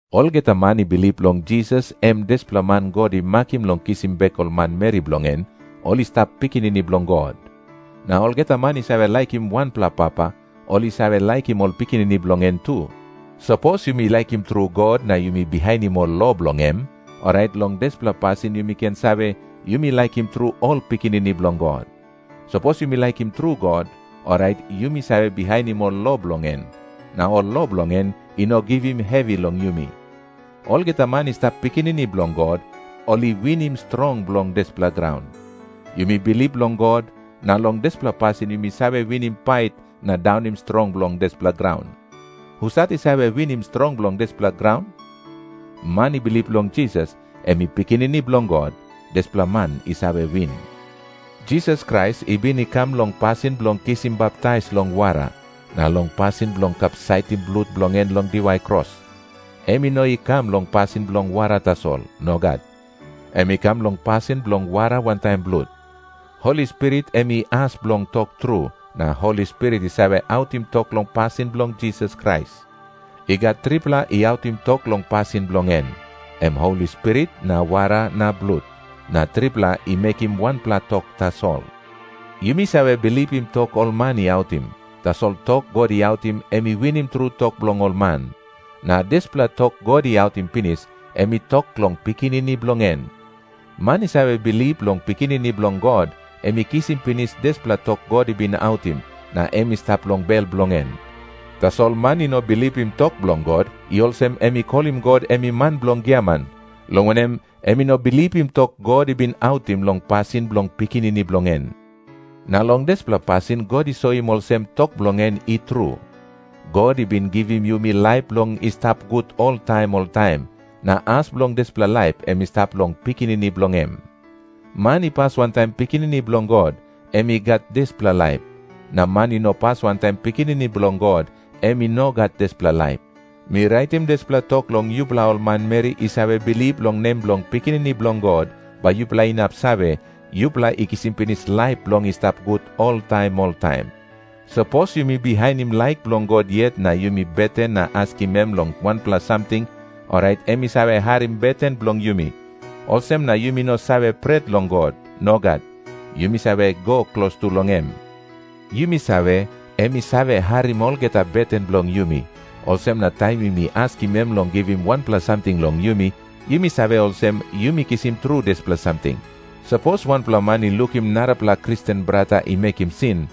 Olgeta man i bilip long Jisas em dispela man God i makim bilong kisim bek ol manmeri bilong en, ol i stap pikinini bilong God. Na olgeta man i save laikim wanpela papa, ol i save laikim ol pikinini bilong en tu. Sapos yumi laikim tru God na yumi bihainim ol lo bilong em, orait long dispela pasin yumi ken save, yumi laikim tru ol pikinini bilong God. Sapos yumi laikim tru God, orait yumi save bihainim ol lo bilong en. Na ol lo bilong en i no givim hevi long yumi. Olgeta man i stap pikinini bilong God, ol i winim strong bilong dispela graun. Yumi bilip long God, na long dispela pasin yumi save winim pait na daunim strong bilong dispela graun. Husat i save winim strong bilong dispela graun? Man i bilip long Jisas em i Pikinini Bilong God, dispela man i save win. Jisas Krais i bin i kam long pasin bilong kisim baptais long wara, na long pasin bilong kapsaitim blut bilong en long diwai kros. Em i no i kam long pasin bilong wara tasol. Nogat. Em i kam long pasin bilong wara wantaim blut. Holi Spirit em i as bilong tok tru, na Holi Spirit i save autim tok long pasin bilong Jisas Krais. I gat tripela i autim tok long pasin bilong en, em Holi Spirit na wara na blut. Na tripela i mekim wanpela tok tasol. Yumi save bilipim tok ol man i autim. Tasol tok God i autim, em i winim tru tok bilong ol man. Na dispela tok God i autim pinis, em i tok long Pikinini bilong en. Man i save bilip long Pikinini Bilong God, em i kisim pinis dispela tok God i bin autim, na em i stap long bel bilong en. Tasol man i no bilipim tok bilong God, i olsem em i kolim God em i man bilong giaman, long wanem, em i no bilipim tok God i bin autim long pasin bilong Pikinini bilong en. Na long dispela pasin God i soim olsem tok bilong en i tru. God i bin givim yumi laip bilong i stap gut oltaim oltaim, na as bilong dispela laip em i stap long Pikinini bilong em. Man i pas wantaim Pikinini Bilong God, em i gat dispela laip. Na man i no pas wantaim Pikinini Bilong God, em i no gat dispela laip. Mi raitim dispela tok long yupela ol manmeri i save bilip long nem bilong Pikinini Bilong God, bai yupela inap save, yupela i kisim pinis laip bilong i stap gut oltaim oltaim. Sapos yumi bihainim laik bilong God yet na yumi beten na askim em long wanpela samting, orait em i save harim beten bilong yumi. Olsem na yumi no save pret long God. Nogat. Yumi save go klostu long em. Yumi save, em i save harim olgeta beten bilong yumi. Olsem na taim yumi askim em long givim wanpela samting long yumi, yumi save olsem yumi kisim tru dispela samting. Sapos wanpela man i lukim narapela Kristen brata i mekim sin,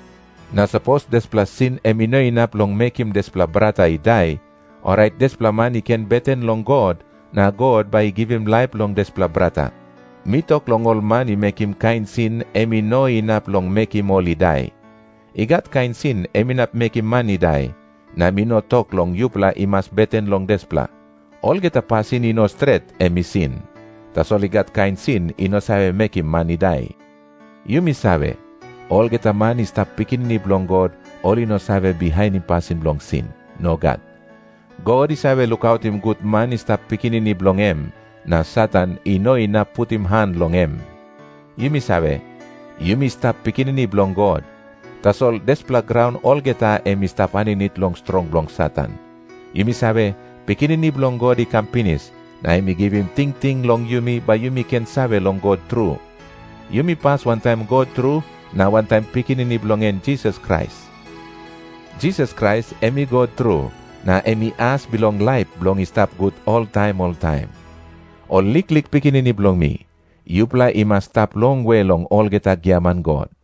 na sapos dispela sin em i no inap long mekim dispela brata i dai, orait dispela man i ken beten long God, na God bai i givim laip long dispela brata. Mi tok long ol man i mekim kain sin em i no inap long mekim ol i dai. I gat kain sin em inap mekim man i dai, na mi no tok long yupela i mas beten long dispela. Olgeta pasin i no stret, em i sin. Tasol i gat kain sin i no save mekim man i dai. Yumi save, olgeta man i stap pikinini bilong God, ol i no save bihainim pasin bilong sin. Nogat. God i save lukautim gut man i stap pikinini bilong em, na Satan i no inap putim han long em. Yumi save, yumi stap pikinini bilong God, tasol dispela graun olgeta em i stap aninit long strong bilong Satan. Yumi save, Pikinini Bilong God i kam pinis, na em i givim tingting long yumi, bai yumi ken save long God tru. Yumi pas wantaim God tru na wantaim Pikinini bilong en Jisas Krais. Jisas Krais em i God tru, na em i as bilong laip bilong i stap gut oltaim oltaim. Ol liklik pikinini bilong mi, yupela i mas i stap longwe long olgeta giaman god.